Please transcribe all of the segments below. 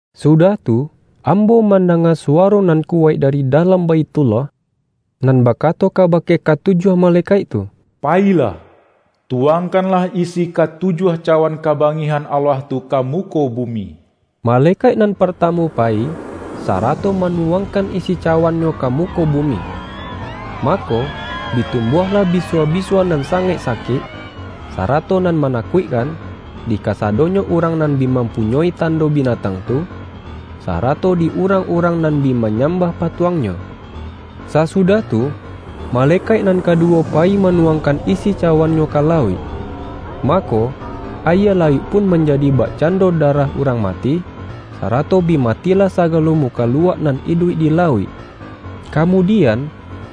Sudah tu, ambo mandanga su-waro nan kuwaik dari dalam Baithullah, nan bakato kabake katu-juah malekaik tu,”Payilah, tuwang-kanlah isi katujuah cawan kabangih-an Allah tu ka muko bumi!” Malekaik nan partamu payi, sarato manuwangkan isi cawannyo ka muko bumi. Mako, bi tumbuahlah bisua-bi-sua nan sangaik sakik, sarato nan ma-nakuikkan, di kasadonyo urang nan bi mampunyoi tando binatang tu, sa-rato di urang-urang nan bi manyam-bah patuangnyo. Sasudah tu, malekaik nan kadu-wo payi manuwangkan isi cawannyo ka lauik. Mako, ayie lauik pun manjadi bakcando darah urang mati, sa-rato bi matilah sagalo mukaluak nan iduik di lauik. Kamudian,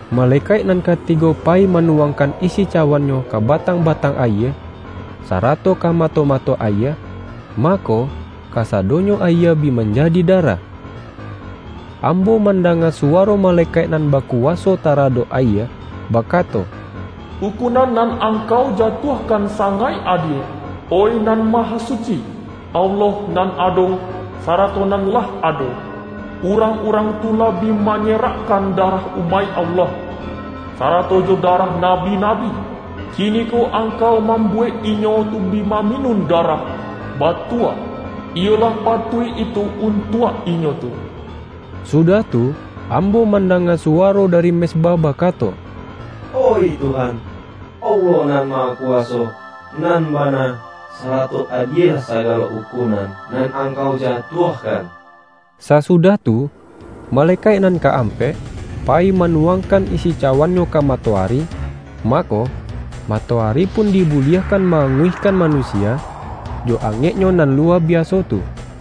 malekaik nan katigo payi manuwangkan isi cawannyo ka batang-batang ayie, sarato ka mato-mato ayie, mako, kasadonyo ayie bi manjadi darah. Ambo, mandanga suwaro malekaik nan bakuwaso tara-dok ayie, bakato,”Ukunan nan Ang-kau jatuahkan sangaik adie, oih Nan Mahasuci, Allah nan ado, sarato nan lah ado! Urang-urang tu lah bi ma-nyerakkan darah umaik Allah, sara-to jo darah nabi-nabi; kiniko Ang-kau mambuwek inyo tu bi maminun darah. Batua, iyo lah patuik itu un-tuak inyo tu!” Sudah tu, ambo man-danga suwaro dari mezbah bakato,”Oih Tuhan, Allah Nan Mahakuwaso, nan bana, sarato adielah sagalo ukun-an nan Angkau jatuahkan!” Sasudah tu, malekaik nan ka-am-pek, payi manuwangkan isi cawan-nyo ka matoari, mako, matoari pun dibuliahkan ma-anguihkan manusia, jo angeknyo nan luwa biaso tu.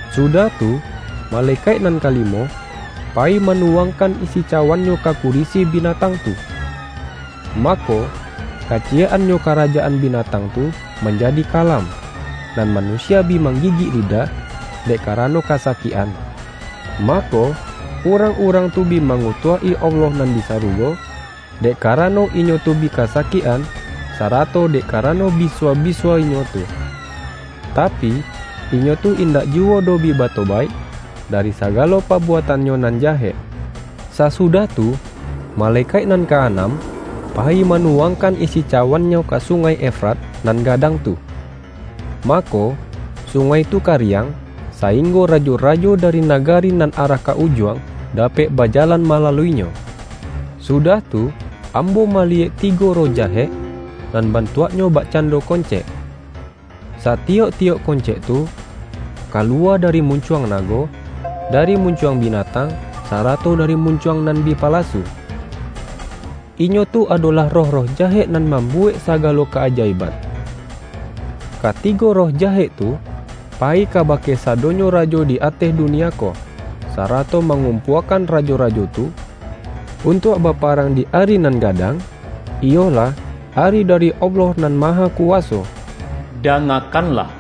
Sudah tu, malekaik nan kalimo, payi manuwangkan isi cawannyo ka kurisi binatang tu. Mako, kaciyek-annyo karajaan binatang tu manjadi kalam, nan manusia bi manggigik li-dah, dek karano kasakik-an. Mako, urang-urang tu bi mangutuak-i Allah nan di sarugo, dek karano inyo tu bi kasakik-an, sarato dek karano bisua-bisua inyo tu. Tapi, inyo tu indak ju-wo doh bi batobaik, dari sagalo pabu-atannyo nan jahek. Sasudah tu, malekaik nan ka-anam, payi manuwangkan isi ca-wannyo ka Sungai Efrat nan gadang tu. Mako, sungai tu kariang, saing-go rajo-rajo dari nagari nan arah ka Ujuang, dapek bajalan malaluinyo. Sudah tu, ambo maliyek tigo roh ja-hek, nan bantuaknyo bakcando kon-cek. Satiyok-tiyok koncek tu, kaluwa dari muncuang nago, dari muncuang binatang, sarato dari muncuang na-bi palasu. Inyo tu adolah roh-roh jahek nan mambuwek sagalo ka-aja-iban. Katigo roh jahek tu, payi kabake sadonyo rajo di ateh dunia ko, sarato mangumpuakan rajo-rajo tu, untuak baparang di Ari nan gadang, iyolah Ari dari Allah Nan Mahakuwaso. ”Dangakanlah!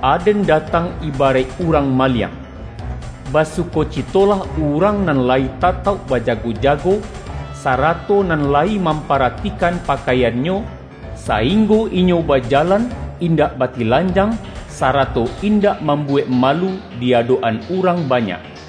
Aden datang iba-raik urang maliang! Basukocitolah urang nan layi tatauk bajago-jago, sa-rato nan layi mamparatikan pakaian-nyo, sainggo inyo bajalan indak ba-tilanjang, sarato indak mambuwek malu di adok-an urang banyak!”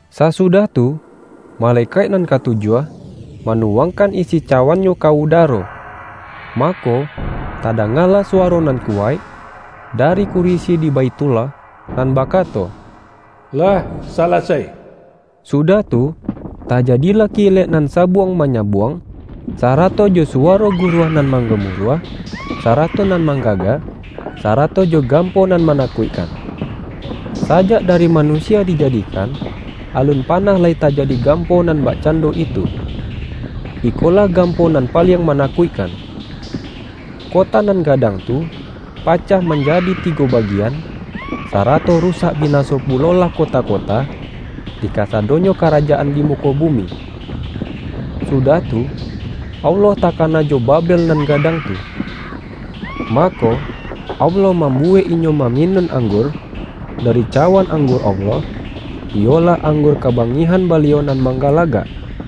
Sasudah tu, malekaik nan katu-juah, manuwangkan isi cawannyo ka udaro. Mako, tadangalah suwaro nan kuwaik, dari kurisi di Baithullah, nan bakato,”Lah salasai!” Sudah tu, tajadilah kilek nan sabuang-manya-buang, sarato jo suwaro guruah nan manggamuruah, sarato nan mangga-ga, sarato jo gampo nan manakuik-kan. Sajak dari manusia dijadikan, alun panah lai tajadi gampo nan bak-cando itu. Ikolah gampo nan paliang manakuikkan! Kota nan gadang tu, pacah manjadi tigo bagian, sarato ru-sak binaso pulolah kota-kota, di kasa-donyo karajaan di muko bumi. Sudah tu, Allah takana jo Babel nan gadang tu. Mako, Allah mambuwek inyo ma-minun anggur, dari cawan -- anggur Allah iyolah anggur kabangihan Baliau nan manggalagak.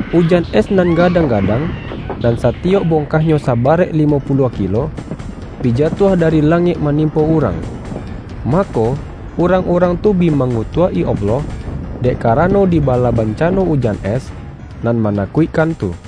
Ujan es nan gadang-gadang, nan satiyok bongkahnyo sabarek limo pu-luah kilo, bi jatuah dari langik ma-nimpo urang. Mako, urang-urang tu bi mangutuak-i Allah, dek karano di bala bancano ujan es, nan manakuik-kan tu.